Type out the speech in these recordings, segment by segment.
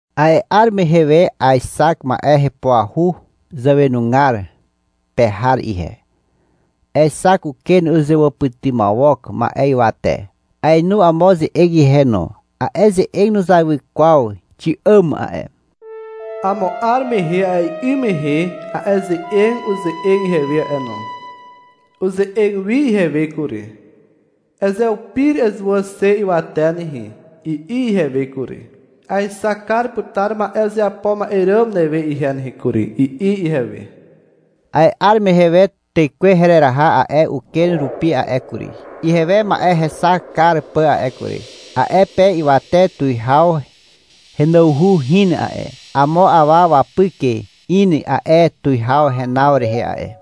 A'e 'ar mehe we aexak ma'e hepuahu zàwenugar pe har ihe. Aexak uken uzewàpytymawok ma'e ywate. Aenu amo ze'eg ihe no. A'e ze'eg nuzawy kwaw xi'àm a'e. Amo 'ar mehe a'e 'ym mehe a'e ze'eg uze'eg ihewe a'e no. Uze'eg wi ihewe kury. — Ezeupir ezuwà xe ywate nehe, i'i ihewe kury. — Aexak kar putar ma'e uzeapo ma'e ràm newe ihe nehe kury, i'i ihewe. A'e 'ar mehe we Tekwe hereraha a'e uken rupi a'e kury, ihewe ma'e hexak kar pà a'e kury. A'e pe ywate tuwihaw henawhu hin a'e. Amo awa wapyk in a'e tuwihaw henaw rehe a'e.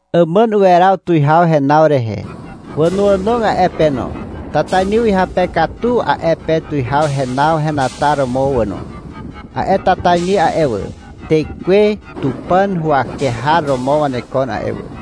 Àmàn uweraw tuwihaw henaw rehe. Wànoànog a'e pe no: tatainy uhyape katu a'e pe tuwihaw henaw henataromo wà no. A'e tatainy a'e wà, tekwe Tupàn huwake har romo wanekon a'e wà.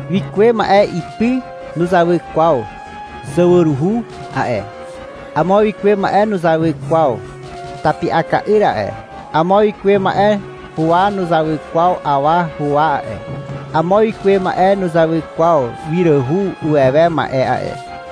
Wikuwe ma'e ipy nuzawy kwaw zawaruhu a'e. Amo wikuwe ma'e nuzawy kwaw tapi'aka'yr a'e. Amo wikuwe ma'e huwa nuzawy kwaw awa huwa a'e. Amo wikuwe ma'e nuzawy kwaw wiràhu uwewe ma'e a'e.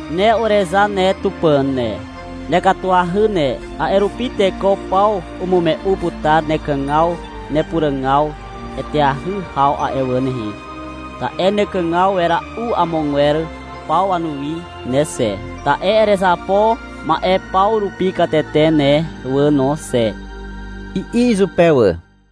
Ne Urezar ne, ne Tupàn ne. Nekatuahy ne, A'e rupi teko paw umume'u putar nekàgaw nepuràg eteahy haw a'e wà nehe, Ta'e nekàg wera'u amogwer paw wanuwi ne xe. Ta'e erezapo ma'e paw rupi katete ne wà no xe, i'i izupe wà.